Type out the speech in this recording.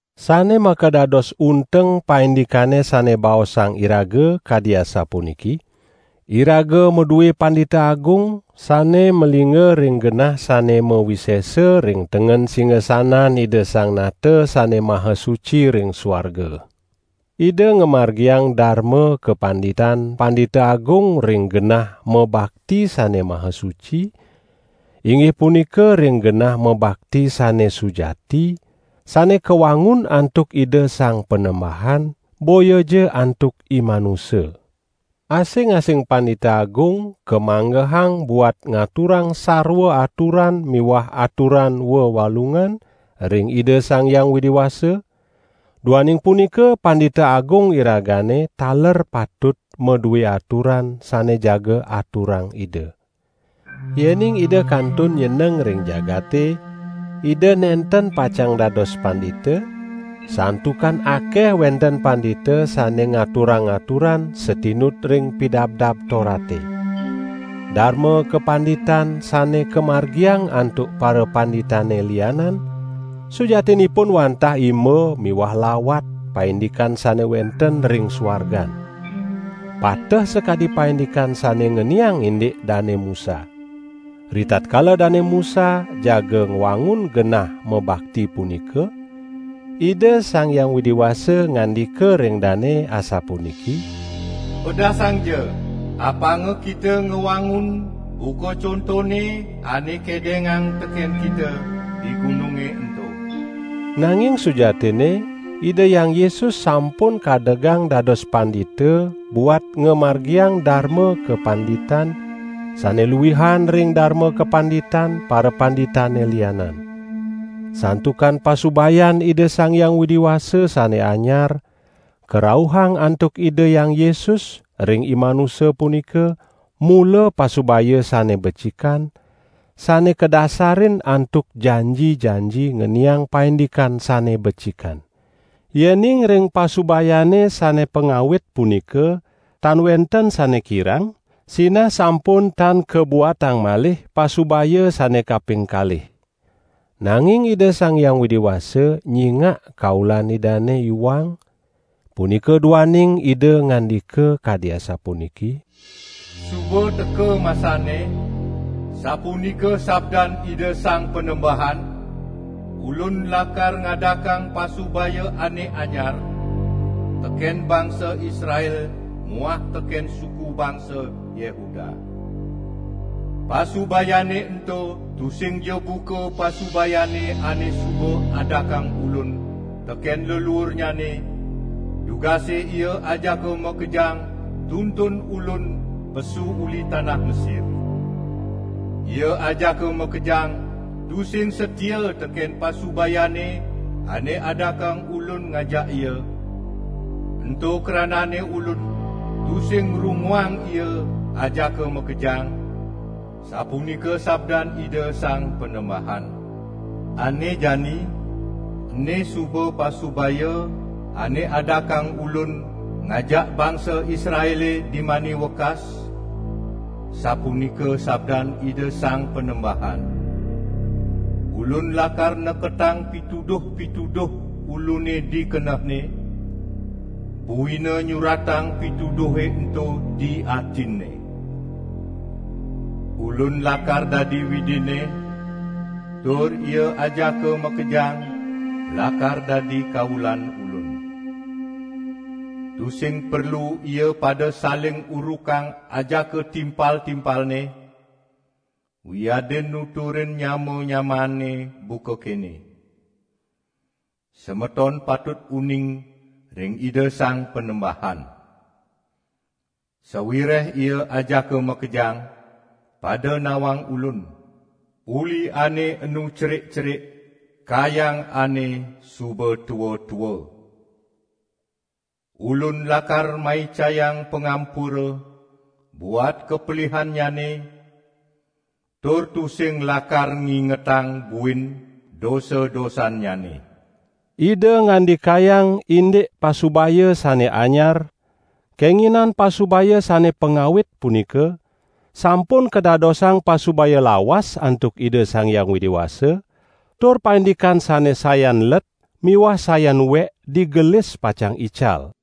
Sane makadados unteng paindikane sane baosang iraga, kadi asapuniki: Iraga madue Pandita Agung, sane malingga ring genah sane mawisesa ring tengen singasanan Ida Sang Nata Sane Maha Suci ring suarga. Ida ngamargiang darma kapanditan Pandita Agung ring genah mabakti Sane Maha Suci, inggih punika ring genah mabakti sane sujati, sane kawangun antuk Ida Sang Panembahan, boyaja antuk imanusa. Asing-asing Pandita Agung kamanggehang buat ngaturang sarwa aturan miwah aturan wewalungan ring Ida Sang Hyang Widi Wasa; duaning punika Pandita Agung iragane taler patut madue aturan sane jaga aturang Ida. Yening Ida kantun nyeneng ring jagate, Ida nenten pacang dados pandita, santukan akeh wenten pandita sane ngaturang aturan satinut ring Pidabdab Torate. Darma kapanditan, sane kamargiang antuk parapanditane lianan sujatinipun wantah imba miwah lawat paindikan sane wenten ring suargan. Pateh sakadi paindikan sane ngeniang indik Dane Musa. Ritatkala Dane Musa jaga ngwangun genah mabakti punika, Ida Sang Hyang Widi Wasa ngandika ring dane asapuniki: "Pedasangja, apanga kita ngwangun buka contone ane kedengang teken kita di gununge ento." Nanging sujatinne Ida Hyang Yesus sampun kadegang dados pandita buat ngamargiang darma kapanditan sane luihan ring darma kapanditan parapanditane lianan. Santukan pasubayan Ida Sang Hyang Widi Wasa sane anyar karauhang antuk Ida Hyang Yesus ring imanusa punika mula pasubaya sane becikan, sane kadasarin antuk janji-janji ngeniang paindikan sane becikan. Yening ring pasubayane sane pangawit punika tan wenten sane kirang, sinah sampun tan kabuatang malih pasubaya sane kaping kalih. Nanging Ida Sang Hyang Widi Wasa nyingak kaulan Idane iwang, punika duaning Ida ngandika kadi asapuniki: "Suba teka masanne, sapunika sabdan Ida Sang Panembahan, Ulun lakar ngadakang pasubaya ane anyar teken bangsa Israel muah teken suku bangsa Yehuda. Pasubayane ento tusingja buka pasubayane ane suba adakang Ulun teken leluurnyane, dugase ia ajaka makejang tuntun Ulun pesu uli tanah Mesir. Ia ajaka makejang tusing satia teken pasubayane ane adakang Ulun ngajak ia, ento kranane Ulun tusing ngrunguang ia ajaka makejang, sapunika sabdan Ida Sang Panembahan. Ane jani, ene suba pasubaya ane adakang Ulun ngajak bangsa Israele dimani wekas, sapunika sabdan Ida Sang Panembahan: Ulun lakar neketang pituduh-pituduh Ulune di kenehne, buina nyuratang pituduhe ento di atinne. Ulun lakar dadi Widinne, tur ia ajaka makejang lakar dadi kaulan Ulun. Tusing perlu ia pada saling urukang ajaka timpal-timpalne, wiadin nuturin nyama-nyamaanne buka kene: 'Semeton patut uning ring Ida Sang Panembahan.' Sawireh ia ajaka makejang pada nawang Ulun, uli ane enu cerik-cerik kayang ane suba tua-tua. Ulun lakar maicayang pangampura buat kapelihannyane, tur tusing lakar ngingetang buin dosa-dosannyane." Ida ngandikayang indik pasubaya sane anyar, kenginan pasubaya sane pangawit punika sampun kadadosang pasubaya lawas antuk Ida Sang Hyang Widi Wasa; tur paindikan sane sayan let miwah sayan uek digelis pacang ical.